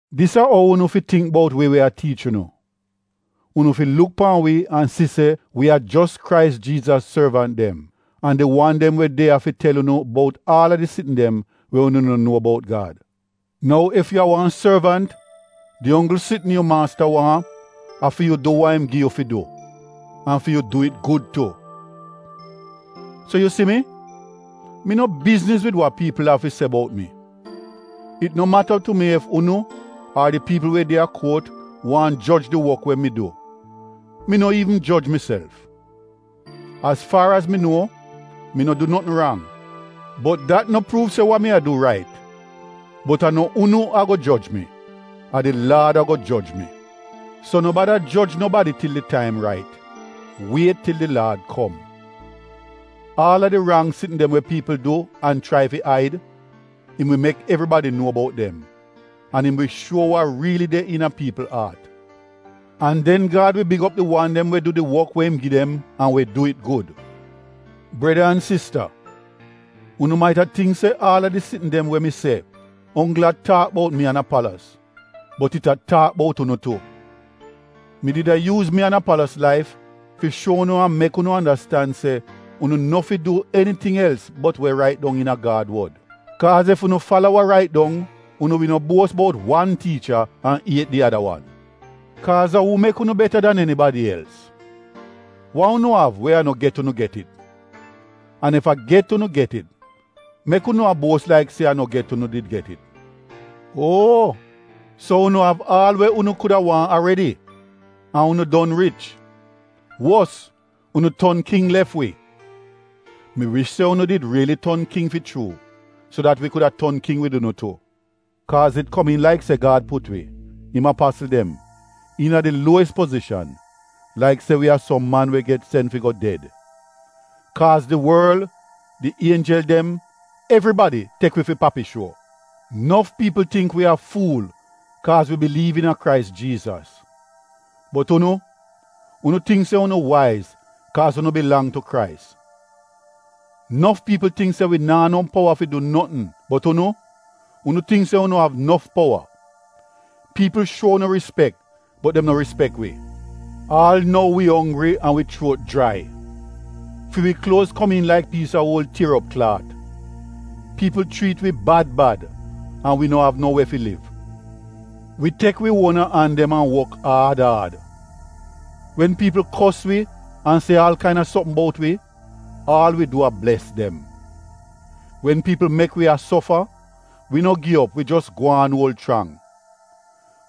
Dis a ou unu fi tingk bout wi we a tiich unu: unu fi luk pan wi an si se wi a jos Krais Jiizas sorvant dem an di wan dem we de ya fi tel unu bout aal a di sitn dem we unu no nuo bout Gad. Nou ef yu a wan sorvant, di onggl sitn yu maasta waahn, a fi yu du wa im gi yu fi du, an fi yu du it gud tu. So yu si mi, mi no bizniz wid wa piipl av fi se bout mi. It no mata tu mi ef unu ar di piipl we de a kuot waahn joj di wok we mi du. Mi no iivn joj miself. Az faar az mi nuo, mi no du notn rang, bot dat no pruuv se wa mi a du rait. Bot a no unu ago joj mi, a di Laad ago joj mi. So no bada joj nobadi til di taim rait. Wiet til di Laad kom. Aal a di rang sitn dem we piipl du an chrai fi aid, im wi mek evribadi nuo bout dem an im wi shuo wa riili de iina piipl aat. An den Gad wi big op di wan dem we du di wok we im gi dem an we du it gud. Breda an sista, unu maita tingk se aal a di sitn dem we mi se onggl a taak bout mi an Apalos bot it a taak bout unu tu. Mi did a yuuz mi an Apalos laif fi shuo unu an mek unu andastan se unu no fi du eniting els bot we rait dong iina Gad wod. Kaaz ef unu fala wa rait dong, unu wi no buos bout wan tiicha an iet di ada wan. Kaaz a uu mek unu beta dan enibadi els? Wa unu av we a no get unu get it? An ef a get unu get it, mek unu a buos laik se a no get unu did get it? Uo! So, unu av aal we unu kuda waahn aredi! An unu don rich! Wos unu ton king lef wi. Mi wish se unu did riili ton king fi chuu, so dat wi kuda ton king wid unu tu. Kaaz it komiin laik se Gad put wi, im apasl dem, iina di luowis pozishan, laik se wi a som man we get sen fi go ded. Kaaz di worl, di ienjel dem — evribadi tek wi fi papi shuo. Nof piipl tingk wi a fuul kaaz wi biliiv iina Krais Jiizas. Bot unu, unu tingk se unu waiz kaaz unu bilang tu Krais. Nof piipl tingk se wi naa no powa fi du notn bot unu, unu tingk se unu av nof powa. Piipl shuo unu rispek bot dem no rispek wi. Aal nou wi onggri an wi chuot jrai. Fi wi kluoz komiin laik piis a uol tier op klaat, piipl chriit wi bad bad an wi no av no we fi liv. Wi tek wi uona an dem an wok aad aad. Wen piipl kos wi an se aal kaina sopm bout wi, aal wi du a bles dem. Wen piipl mek wi a sofa, wi no gi op wi jos gwaan uol chrang.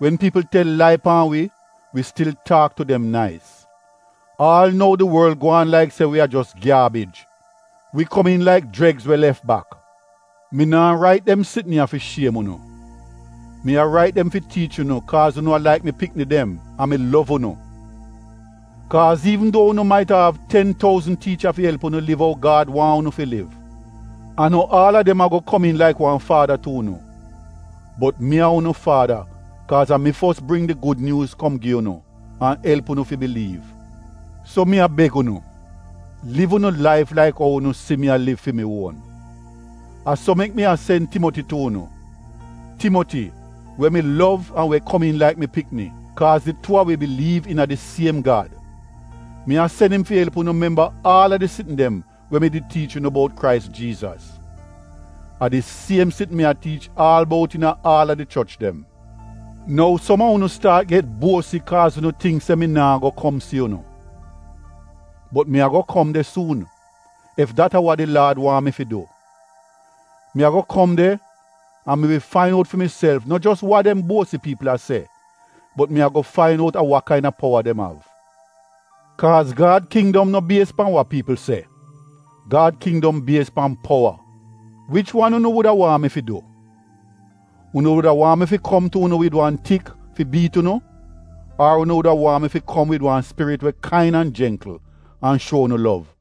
Wen piipl tel lai pan wi, wi stil taak tu dem nais. Aal nou di worl gwaan laik se wi a jos gyaabij, wi komiin laik jregs we lef bak. Mi naa rait dem sitn ya fi shiem unu. Mi a rait dem fi tiich unu kaaz unu a laik mi pikni dem an mi lov unu. Kaaz iivn duo unu maita av ten touzn tiicha fi elp unu liv ou Gad waahn unu fi liv, a no aal a dem ago komiin laik wan faada tu unu. Bot mi a unu faada kaaz a mi fos bring di Gud Nyuuz kom gi unu an elp unu fi biliiv. So mi a beg unu, liv unu laif laik ou unu si mi a liv fi mi uon. A so mek mi a sen Timoti tu unu, Timoti we mi lov an we komiin laik mi pikni kaaz di tuu a wi biliiv iina di siem Gad. Mi a sen im fi elp unu memba aal a di sitn dem we mi did tiich unu bout Krais Jiizas. A di siem sitn mi a tiich aal bout iina aal a di choch dem. Nou som a unu staat get buosi kaaz unu tingk se mi naa go kom si unu. Bot mi ago kom de suun, ef dat a wa di Laad waahn mi fi du. Mi ago kom de an mi wi fain out fi miself no jos wa dem buosi piipl a se bot mi ago fain out a wa kaina powa dem av. Kaaz Gad kindom no bies pan wa piipl se, Gad kindom bies pan powa. Wich wan unu wuda waahn mi fi du? Unu wuda waahn mi fi kom tu unu wid wan tik fi biit unu ar unu wuda waahn mi kom wid wan spirit we kain an jengkl an shuo unu lov?